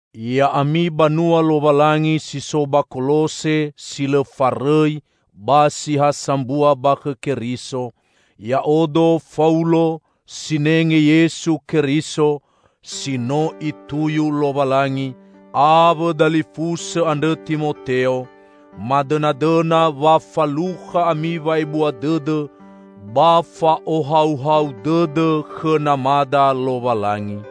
Ya'ami banua Lowalangi si so ba Kolose si lõ farõi ba si ha sambua ba khõ Keriso! Ya'odo, Faulo, sinenge Yesu Keriso, -- si no Ituyu Lowalangi -- awõ dalifusõ andrõ Timoteo, madõnadõna wa falukha ami wa'ebua dõdõ ba fa'ohauhau dõdõ khõ Namada Lowalangi.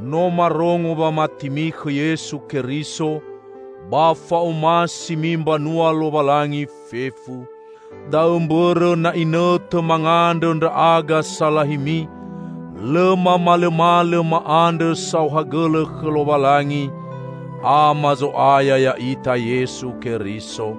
No marongo wamatimi khõ Yesu Keriso ba fa'omasimi mbanua Lowalangi fefu. Da'õ mbõrõ na inõtõ mangandrõ ndra'aga salahimi, lõ mamalõmalõ ma'andrõ saohagõlõ khõ Lowalangi, Ama Zo'aya ya'ita Yesu Keriso.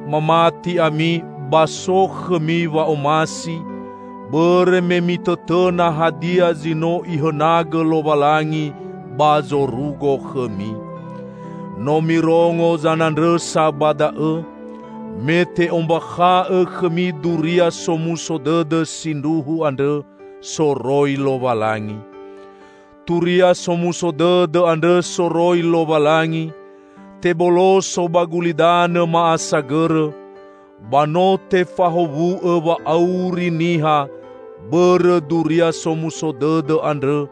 Mamati ami ba so khõmi wa'omasi, bõrõ me mitõtõna hadia zi no Ihõnagõ Lowalangi ba zorugo khõmi. No mirongo zanandrõsa ba da'õ, me te'ombakha'õ khõmi Duria Somuso Dõdõ sindruhu andrõ soroi Lowalangi. Turia Somuso Dõdõ andrõ soroi Lowalangi teboloso ba gulidanõ ma'asagõrõ, ba no tefahowu'õ wa'auri niha bõrõ Duria Somuso Dõdõ andrõ,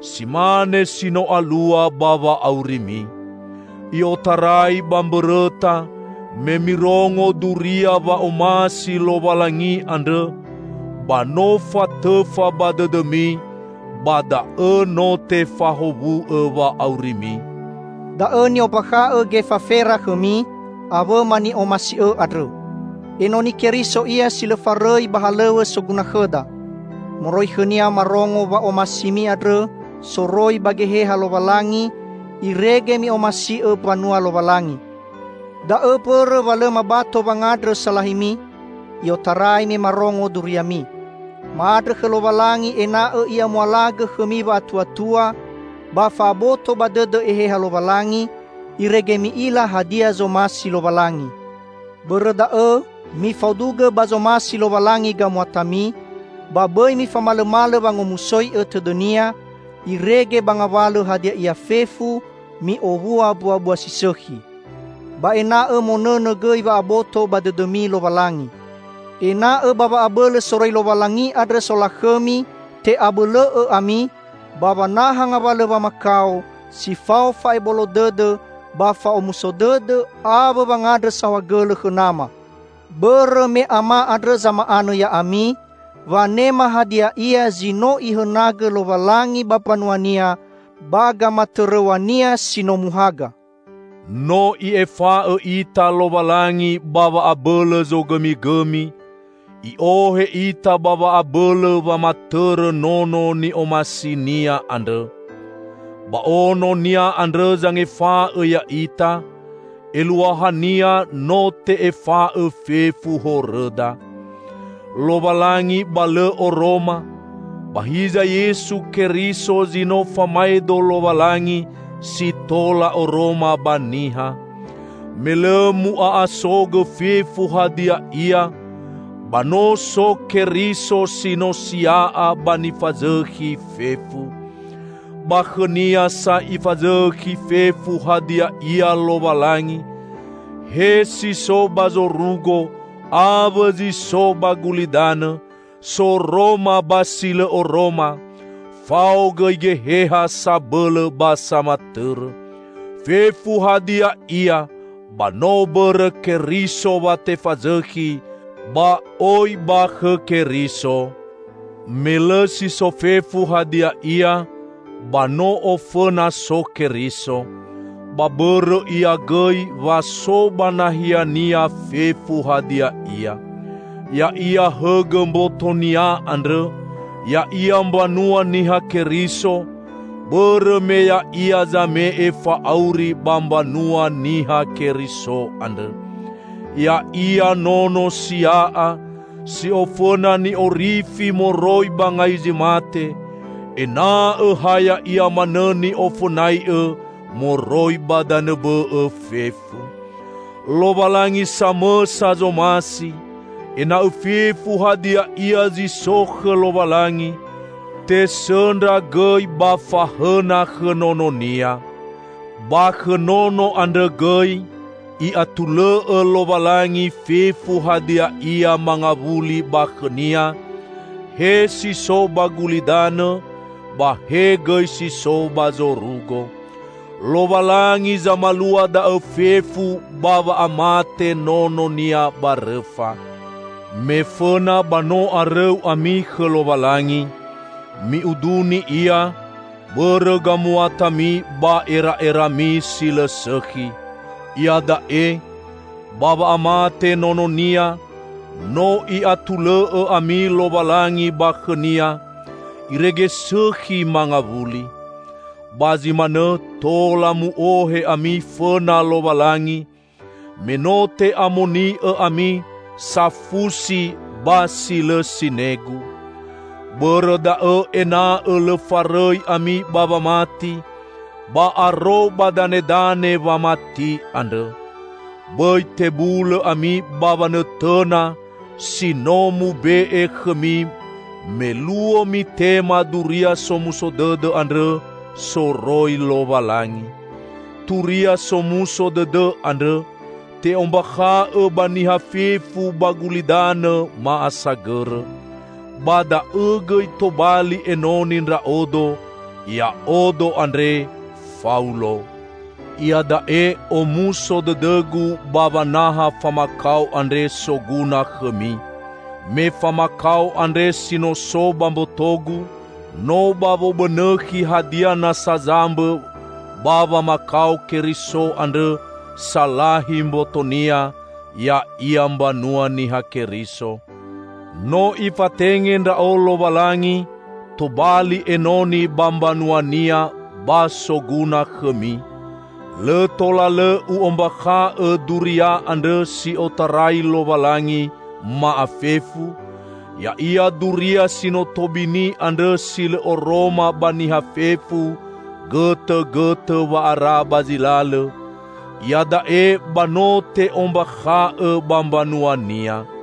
si mane si no alua ba wa'aurimi. I'otarai ba mbõrõta me mirongo duria wa'omasi Lowalangi andrõ, ba no fatõfa ba dõdõmi, ba da'õ no tefahowu'õ wa'aurimi. Da'õ ni'ombakha'õ Gefafera khõmi, awõma ni'omasi'õ andrõ. Enoni Keriso ia si lõ farõi ba halõw̃õ soguna khõda. Moroi khõnia marongo wa'omasimi andrõ soroi ba Geheha Lowalangi, irege mi'omasi'õ mbanua Lowalangi. Da'õ mbõrõ wa lõ mabato wangandrõ salahimi, i'otarai me marongo duriami. Ma'andrõ khõ Lowalangi ena'õ I'amualagõ khõmi wa'atuatua ba fa'aboto ba dõdõ Eheha Lowalangi, irege mi'ila hadia zomasi Lowalangi. Bõrõ da'õ mifaudugõ ba zomasi Lowalangi gamuatami, ba bõi mifamalõmalõ wangomusoi'õ tõdõ-Nia, irege ba ngawalõ hadia ia fefu mi'owua mbuabua si sõkhi. Ba ena'õ monõnõ gõi wa'aboto ba dõdõmi Lowalangi. Ena'õ ba wa'abõlõ soroi Lowalangi andrõ solakhõmi te'abõlõ'õ ami, ba wanaha ngawalõ wamakao, si fao fa'ebolo dõdõ ba fa'omuso dõdõ awõ wangandrõ saohagõlõ khõ Nama. Bõrõ me Ama andrõ zama'anõ ya'ami wanema hadia ia zi no Ihõnagõ Lowalangi ba mbanua-Nia ba gamatõrõw̃a-Nia si no muhaga. No I'efa'õ ita Lowalangi ba wa'abõlõ zogõmigõmi, I'ohe ita ba wa'abõlõ wamatõrõ Nono ni'omasi-Nia andrõ. Ba Ono-Nia andrõ zangefa'õ ya'ita; eluahania no te'efa'õ fefu horõda. Lowalangi ba lõ oroma, ba hiza Yesu Keriso zi no famaedo Lowalangi si tola oroma ba niha. Me lõ mu'a'asogõ fefu hadia ia, ba no so Keriso si no sia'a ba nifazõkhi fefu. Ba khõ-Nia sa Ifazõkhi fefu hadia ia Lowalangi, he si so ba zorugo awõ zi so ba gulidanõ, soroma ba si lõ oroma, fao gõi geheha sabõlõ ba samatõrõ. Fefu hadia ia ba no bõrõ Keriso wa tefazõkhi, ba oi ba khõ Keriso. Me lõ si so fefu hadia ia, ba no ofõna so Keriso. Ba bõrõ Ia gõi wa so ba nahiania fefu hadia ia. Ya'ia hõgõ mboto-Nia andrõ, ya'ia mbanua Niha Keriso, bõrõ me Ya'ia zame'e fa'auri ba mbanua Niha Keriso andrõ. Ya'ia nono sia'a, si ofõna ni'orifi moroi ba ngai zi mate, ena'õ ha Ya'ia manõ ni'ofõnai'õ moroi ba danõ bõ'õ fefu. Lowalangi samõsa zomasi, ena'õ fefu hadia ia zi so khõ Lowalangi, tesõndra gõi ba fahõna khõ Nono-Nia. Ba khõ Nono andrõ gõi, I'atulõ'õ Lowalangi fefu hadia ia mangawuli ba khõ-Nia -- he si so ba gulidanõ, ba he gõi si so ba zorugo. Lowalangi zamalua da'õ fefu ba wa'amate Nono-Nia ba rõfa. Mefõna ba no arõu ami khõ Lowalangi. Mi'uduni Ia, bõrõ gamuatami ba era'erami si lõ sõkhi. Iada'e, ba wa'amate Nono-Nia, no I'atulõ'õ ami Lowalangi ba khõ-Nia, irege sõkhi mangawuli. Ba zi manõ tola mu'ohe ami fõna Lowalangi, me no te'amoni'õ ami, safusi, ba si lõ sinegu. Bõrõ da'õ ena'õ lõ farõi ami ba wamati ba aro ba danedane wamati andrõ. Bõi tebulõ ami ba wanõtõna si no mube'e khõmi me luo mitema Duria Somuso Dõdõ andrõ soroi Lowalangi. Turia Somuso Dõdõ andrõ te'ombakha'õ ba niha fefu ba gulidanõ ma'asagõrõ. Ba da'õ gõi tobali enoni ndra'odo, ya'odo andre Faulo. Iada'e omuso dõdõgu ba wanaha famakao andre soguna khõmi. Me famakao andre si no so ba mbotogu, no ba wobõnõkhi hadia nasa zambõ ba wamakao Keriso andrõ salahi mboto-Nia, ya'ia mbanua Niha Keriso. No Ifatenge ndra'o Lowalangi tobali enoni ba mbanua-Nia ba soguna khõmi. Lõ tola lõ u'ombakha'õ Duria andrõ si otarai Lowalangi, ma'afefu; ya'ia duria si no tobini andrõ si lõ oroma ba niha fefu gõtõgõtõ wa'ara ba zi lalõ, iada'e ba no te'ombakha'õ ba mbanua-Nia.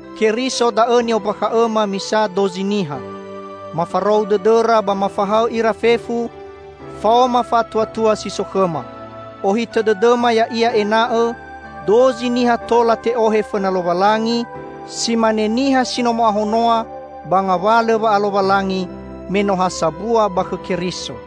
Keriso da'õ ni'ombakha'õma misa dozi niha. Mafarou dõdõra ba mafahaõ ira fefu, faoma fa'atuatua si so khõma. Ohitõ dõdõma ya'ia ena'õ dozi niha tola te'ohe fõna Lowalangi, si mane niha si no mo'ahonoa ba ngawalõ wa'alowalangi, me no ha sambua ba khõ Keriso.